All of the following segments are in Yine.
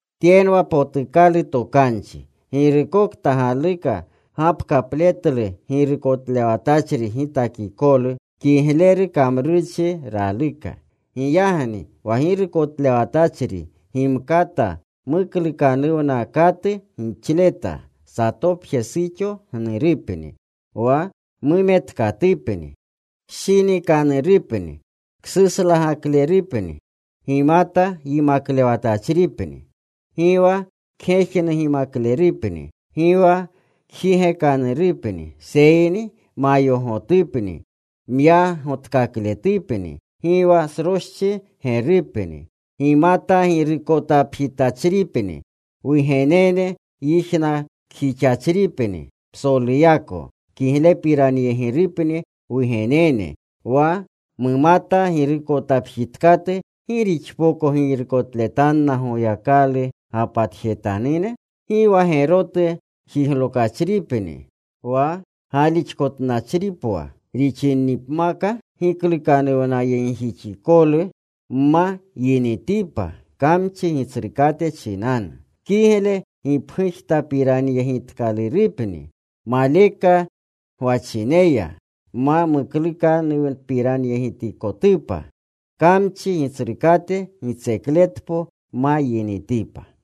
Tyenwa potukalu tokanchi. Girukokta galuka gapkatletlu girukotlewatachri gitakikolu, kigleru kamrurchi raluka. Giyagni wa girukotlewatachri gimkata muklukanuwnakatu gixleta, satopje suxo gnurupni, wa mumetkatupni, kshinikanurupni, ksuslagaklerupni, gimata yimaklewatachripni. Gi wa kgejnugimaklerupni. Gi wa kjigekanurupni, seyni mayogotupni, myagotkakakletupni. Gi wa sroschi gerupni. Gimata girukotapjitachripni. Wugenene yijnakjixachripni. Psoluyako kiglepiranyegirunepni wugenene. Wa mumata girukotapjitkatu ¿gi rixpoko girukotletanna Goyakalu gapatjetanune? Gi wa gerotu jiglokachripni, wa galixkotnachripwa rixinipmaka, giklukanuwnayegjixikolu ma yinitipa kamchi gitsrukate chinanu. Kigle gipgujtapiranyegitikalurupni maleka gwachineya, ma muklukpiranyegitikotupa, kamchi gitsrukate gitsekletpo ma yinitipa.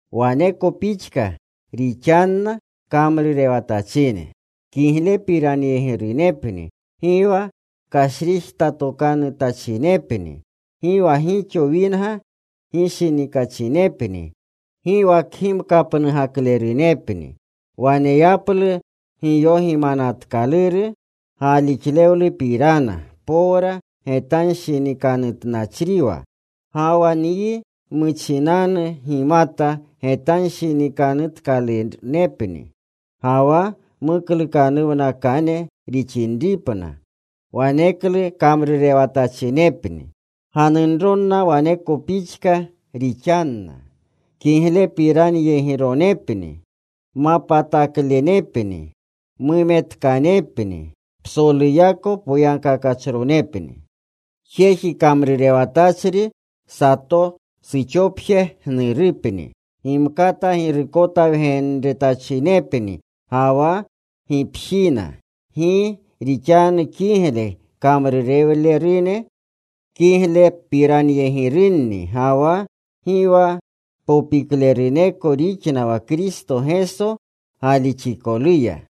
Waneko pixka rixanna kamrurewatachine. Kiglepiranyegirunepni. Gi wa kashrijtatokanutachinepni. Gi wa gixo winga gishinikachinepni. Gi wa kgimkapnugaklerunepni. Waneyaplu giyogimanatkaluru galixlewlupirana, powra getanshinikanutnachriwa. Ga wa nyi muchinanu gimata getanshinikanutkalunepni. Ga wa muklukanuwnakane rixinipna, waneklu kamrurewatachinepni. Ganunronna waneko pixka rixanna. Kiglepiranyegironepni. Mapataklenepni. Mumetkanepni. Psoluyako poyagkakachronepni. Jeji kamrurewatachri sato suxopje gnurupni. Gimkata girukotawgenetachinepni ga wa gipjina. Gi rixanu kigle kamrurewlerune kiglerupiranyegirunni. Ga wa gi wa popikleruneko rixna wa Kristo Geso galixikoluya.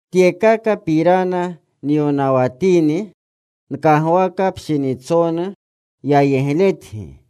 Tyekakapirana nyonawanatini, nkagwaka pshinitsonu yayegletyi.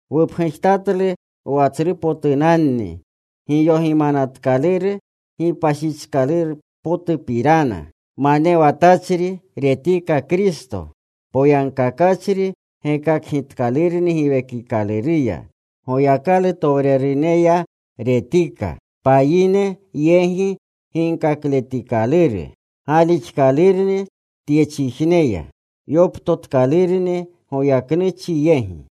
Wupgujtatlu wa tsrupotunanni giyogimanatkaluru gipashichkalurupirana: Manewatachri retika Kristo. Poyagkakachri gekakgitkalurni Giwekikaluruya. Goyakalutowreruneya retika. Payine yegi ginkakletikaluru. Galixkalurni tyechijneya. Yoptotkalurni goyaknuchygi.